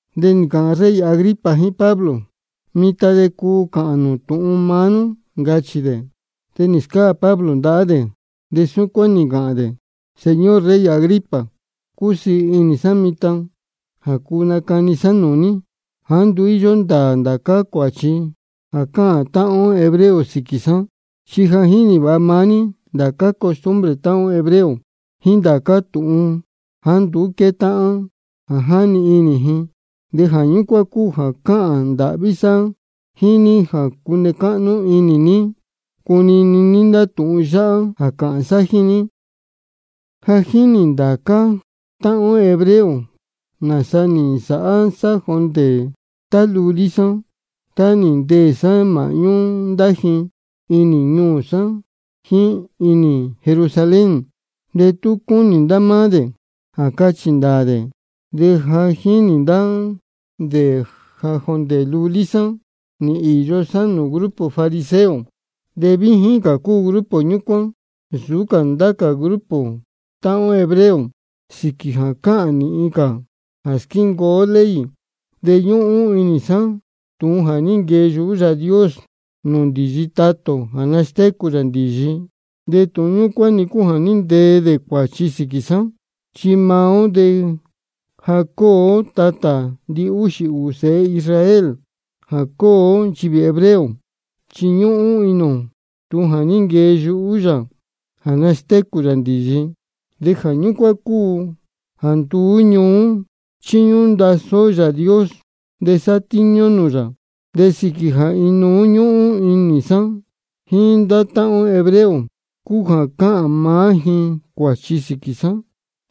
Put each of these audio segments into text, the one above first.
De nī ncāhān rey Agripa jíín Pablo: Mitan de cuu cāhān nū tūhun maá nú, ncachī dē. De nī scáā Pablo ndahá dē, de súcuán nī ncāhān dē: Señor rey Agripa, cúsiī inī sá mitan jā cuu nacani sá nūū ní jāá nduú íyó ndāā ndācá cuāchi jā cáhān táhán ó hebreo sīquī sá. Chi ja jínī vāha maá ní ndācá costumbre táhán ó hebreo jíín ndācá tūhun jāá nduú quétáhán jā jáni inī ji. De jā ñúcuán cúu jā cáhān ndāhví sá jíín ní jā cune cáhnú inī ní cunini ní ndá tūhun yáhá jā cāhān sá jíín ní. Ja jínī ndācá táhán ó hebreo nāsa nī nsāhá sá jondē tá lulí sá, tá nī ndeē sá māhñú ndá ji inī ñuū sá jíín inī Jerusalén. De tú cúnī ndá máá dē jā cachī ndāā dē, de ja jínī ndá dē jā jondē lulí sá nī īyo sá nūū grupo fariseo. De víjín cā cúu grupo ñúcuán nsūú cā ndá cā grupo táhán ó hebreo sīquī jā cáhān nīhin cā jā squíncuu ó ley. De ñúhún inī sá tūhun jā ní nquee yuhú Yāā Dios nūū ndīyi tatā ō jā nastécū yā ndīyi, de tūhun ñúcuán-ni cúu jā ní ntee dē cuāchi sīquī sá. Chi maá ó jā cúu ó tatā ndihúxī ūū sēhe Israel jā cúu ó nchivī hebreo, chi ñúhún inī ō tūhun jā ní nquee yuhú yā jā nastécū yā ndīyi. De jā ñúcuán cúu jā nduú ñuú chíñúhún ndasí ó Yāā Dios de sátíñú ó nūū yā. De sīquī jā inuú-ni ñúhún inī sá jíín ndá táhán ó hebreo cúu jā cáhān maá ji cuāchi sīquī sá,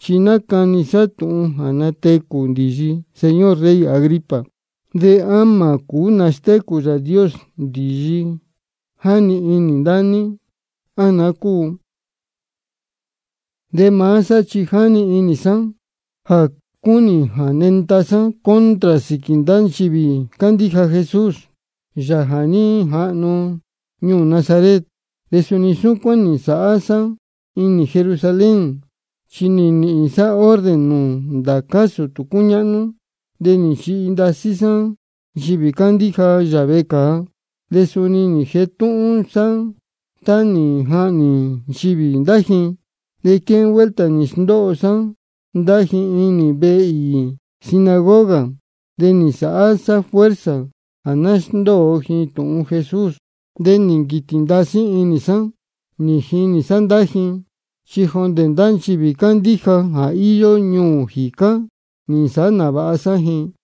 chi nácani sá tūhun jā natecū ndīyi, señor rey Agripa. ¿De á mā cūú nastécū Yāā Dios ndīyi jáni inī ndá ní, á naá cúu? De maá sá chi nī jani inī sá jā cúnī jā nenda sá contra sīquī ndá nchivī cándíja Jesús, Yāā jā ní jahnu ñuū Nazaret. De suni súcuán nī nsāhá sá inī Jerusalén, chi nī nīhīn sá orden nūū ndācá sūtū cúñáhnú, de nī nchihi ndasí sá nchivī cándíja yā vecāa. De suni nī jetúhún sá tá nī jahnī nchivī ndá ji. De quéhén vuelta nī sndóho sá ndá ji inī ndá vehe īī sinagoga, de nī nsāhá sá fuerza jā ná sndóo ji tūhun Jesús. De nī nquītī ndasí inī sá nī jinī sá ndá ji, chi jondē ndá nchivī cándíja jā íyó ñuū jīcá nī nsāhá nāvāha sá ji.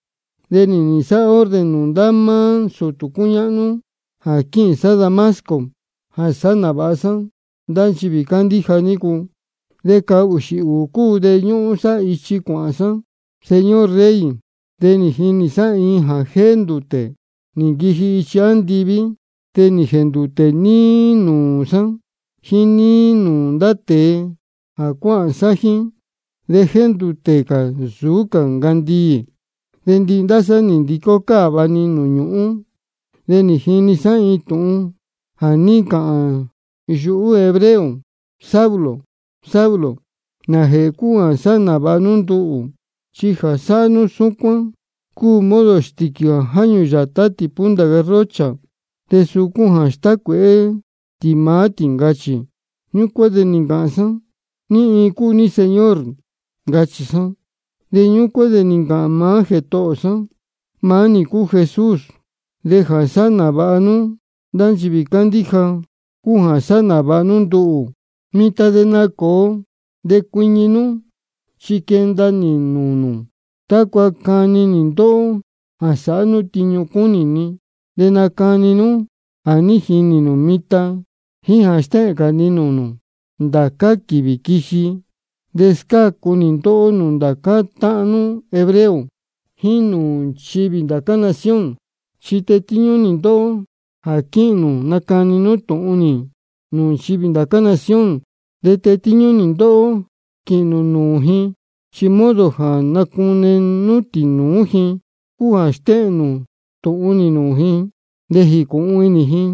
De nī nīhīn sá orden nūū ndá máá sūtū cúñáhnú jā quíhīn sá Damasco jā sāhá nāvāha sá ndá nchivī cándíja nícu. De cahūxī ūū cúu de ñúhún sá ichi cuāhān sá, señor rey. De nī jinī sá iin jā jéndūtē nī nquiji ichi andiví. De nī jēndūtē-ni níí nūū sá jíín níí nūū ndá tēe jā cuáhān sá jíín, de jéndūtē cā nsūú cā ncandiī. De ndihi ndá sá nī ndicó cáva-ni nūū ñūhún. De nī jini sá iin tūhun jā ní ncāhān yuhú hebreo: Saulo, Saulo, ¿nājēhē cúu jā sáhá nāvāha nú nduhū? Chi jā sáhá nú súcuán cúu modo stīquī jā jáñū yātá tī punta garrocha, de suu cúu jā stácuēhé tī maá tī, ncachī. Ñúcuán de nī ncāhān sá: ¿Ní iin cúu ní, Señor? ncachī sá. De ñúcuán de nī ncāhān maá Jētohō sá: Maá nī cúu Jesús, de jā sáhá nāvāha nú ndá nchivī cándíja cúu jā sáhá nāvāha nú nduhū. De mitan de nacōo de cuiñi nú, chi nī nquenda nī nūū nū tácua cani nī ndóhó jā sāhá nú tiñu cúnī ni de nacani nú jā ní jinī nū mitan jíín jā stéhēn cā ni nūū nū ndá quīvī quiji. De scácu nī ndóhó nūū ndācá táhán nú hebreo jíín nūū nchivī ndá cā nación. Chi tetíñú nī ndóhó jā quíhīn nū nacani nú tūhun nī nūū nchivī ndá cā nación. De tetíñú nī ndóhó quīhīn nū nūū ji, chi modo jā nacune nú tīnūú ji cúu jā stéhēn nū tūhun nī nūū ji de jīcūhun inī ji.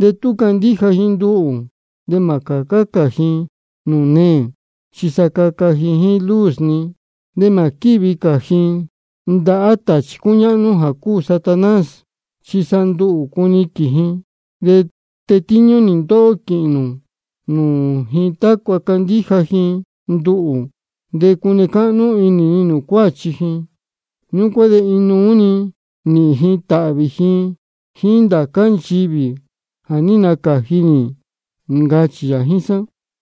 De tú candíja ji nduhū de mā cācá cā ji nūū neē, chi sa caca ji jíín luz ni. De mā quīhí cā ji ndahá tāchī cúñáhnú jā cúu Satanás, chi sa nduhū cuniquīn ji. De tetíñú nī ndóhó quīhīn nū nūū ji tácua candíja ji nduhū de cune cáhnú inī ni nūū cuáchi ji. Ñúcuán de inuú-ni nīhīn ji tāhvī ji jíín ndá cā nchivī jā ní nacāji nī, ncachī yā jíín sá.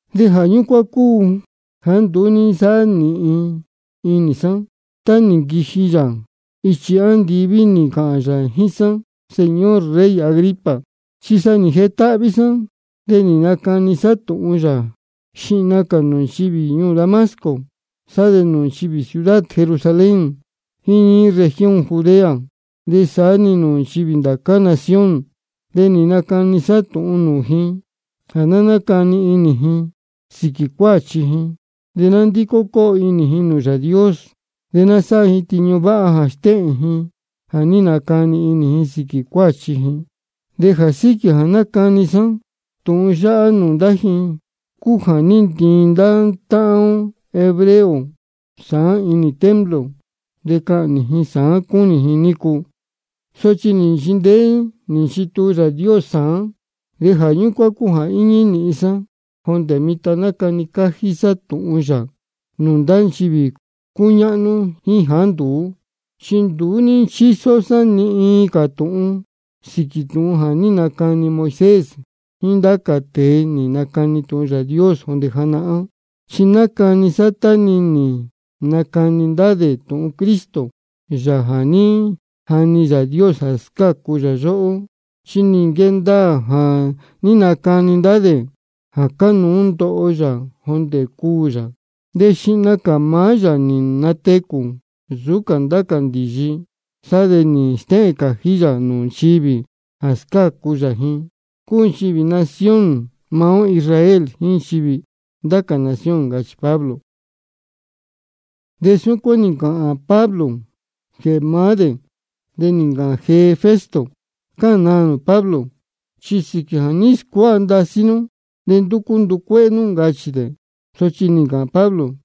De jā ñúcuán cúu jāá nduú ní nsáhá nīhin inī sá tá nī nquiji yā ichi andiví nī ncāhān yā jíín sá, señor rey Agripa. Chi sa nī jetáhví sá, de nī nacani sá tūhun yā, xihna cā nūū nchivī ñuū Damasco de sá de nūū nchivī ciudad Jerusalén jíín níí región Judea de saá-ni nūū nchivī ndá cā nación. De nī nacani sá tūhun nūū ji jā ná nácani inī ji sīquī cuáchi ji, de ná nándicó cóo inī ji nūū Yāā Dios, de ná sáhá ji tiñu váha jā stéhēn ji jā ní nacani inī ji sīquī cuáchi ji. De jā síquī jā nácani sá tūhun yáhá nūū ndá ji cúu jā ní ntiin ndá táhán ó hebreo sāán inī templo, chi cahnī ji sāán cúnī ji nícu. Sochi nī nchindeé nī nchituu Yāā Dios sāán, de jā ñúcuán cúu jā íñí nīhin sá jondē mitan nácani cájí sá tūhun yā nūū ndá nchivī cúñáhnú jíín jāá nduú. Chi nduú chísó sá ni iin cā tūhun sīquī tūhun jā ní nacani Moisés jíín ndá cā tēe nī nacani tūhun Yāā Dios jondē janahán. Chi nácani sá tá-ni nī nacani ndá dē tūhun Cristo, Yāā jā ní jani Yāā Dios jā scácu yóhó. Chi nī nquee ndaā jā ní nacani ndá dē jā cánuú ndoho yā jondē cuū yā, de xihna cā maá yā nī natecū nsūú cā ndá cā ndīyi, sá de nī stéhēn cājí yā nūū nchivī jā scácu yā ji, cúu nchivī nación maá ó Israel jíín nchivī ndá cā nación, ncachī Pablo. De súcuán nī ncāhān Pablo jēhē maá dē, de nī ncāhān jee Festo: Cáhān naā nū, Pablo, chi sīquī jā ní scuáha ndasí nú de ndúcú nducuéhé nú, ncachī dē. Sochi nī ncāhān Pablo: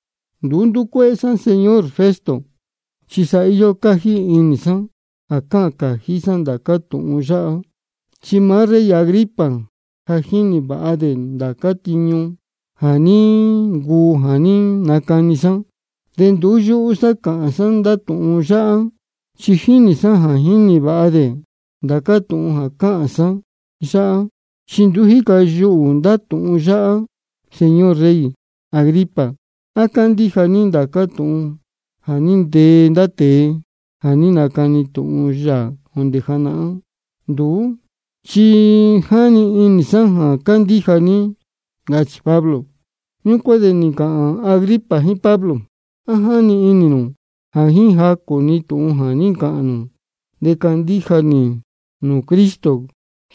Nduú ndúcuéhé sá, señor Festo, chi sa íyó cájí inī sá jā cáhān cājí sá ndācá tūhun yáhá. Chi maá rey Agripa ja jínī vāha dē ndācá tiñu jā ní ncuu jā ní nacani sá. De nduú yúhú sá cáhān sá ndá tūhun yáhá, chi jínī sá jā jínī vāha dē ndācá tūhun jā cáhān sá yáhá, chi nduú jíca yuhū ndá tūhun yáhá. Señor rey Agripa, ¿á cándíja ní ndācá tūhun jā ní ntee ndá tēe jā ní nacani tūhun yā jondē janahán? Nduú chi jáni inī sá jā cándíja ní, ncachī Pablo. Ñúcuán de nī ncāhān Agripa jíín Pablo: ¿A jáni inī nū jā jíín jacū-ni tūhun jā ní ncāhān nū de candíja nī nūū Cristo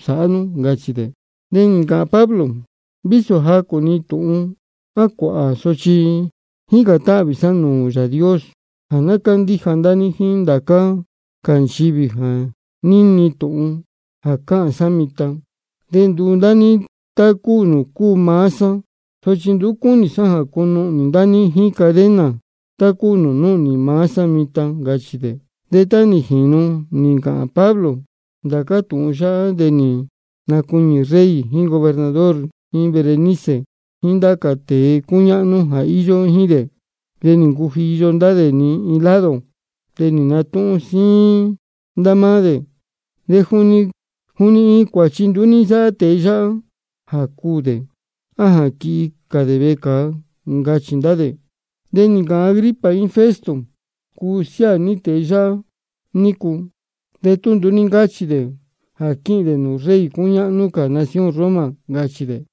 sāhá nú? ncachī dē. De nī ncāhān Pablo: Vísō jacū-ni tūhun á cuāhā sochi jícān táhvī sá nūū Yāā Dios jā ná cándíja ndá ní jíín ndācá cā nchivī jā níni tūhun jā cáhān sá mitan de nduu ndá ní tá nūū cúu maá sá, sochi nduú cúnī sá jā cunuhnī ndá ní jíín cadena tá cúu nūū núhnī sá mitan, ncachī dē. De tá nī jīnu nī ncāhān Pablo ndācá tūhun yáhá de nī nacuiñī rey jíín gobernador jíín Berenice jíín ndá cā tēe cúñáhnú jā íyó jíín dē. De nī ncujiyo ndá dē iin lado, de nī natúhún síín ndá máá dē: Juni iin cuāchi nduú ní nsáhá tēe yáhá jā cuū dē á jā quihi cā dē vecāa, ncachī ndá dē. De nī ncāhān Agripa jíín Festo: Cuu siáā ní tēe yáhá nícu de tú nduú ní ncáchī dē jā quíhīn dē nūū rey cúñáhnú cā nación Roma, ncachī dē.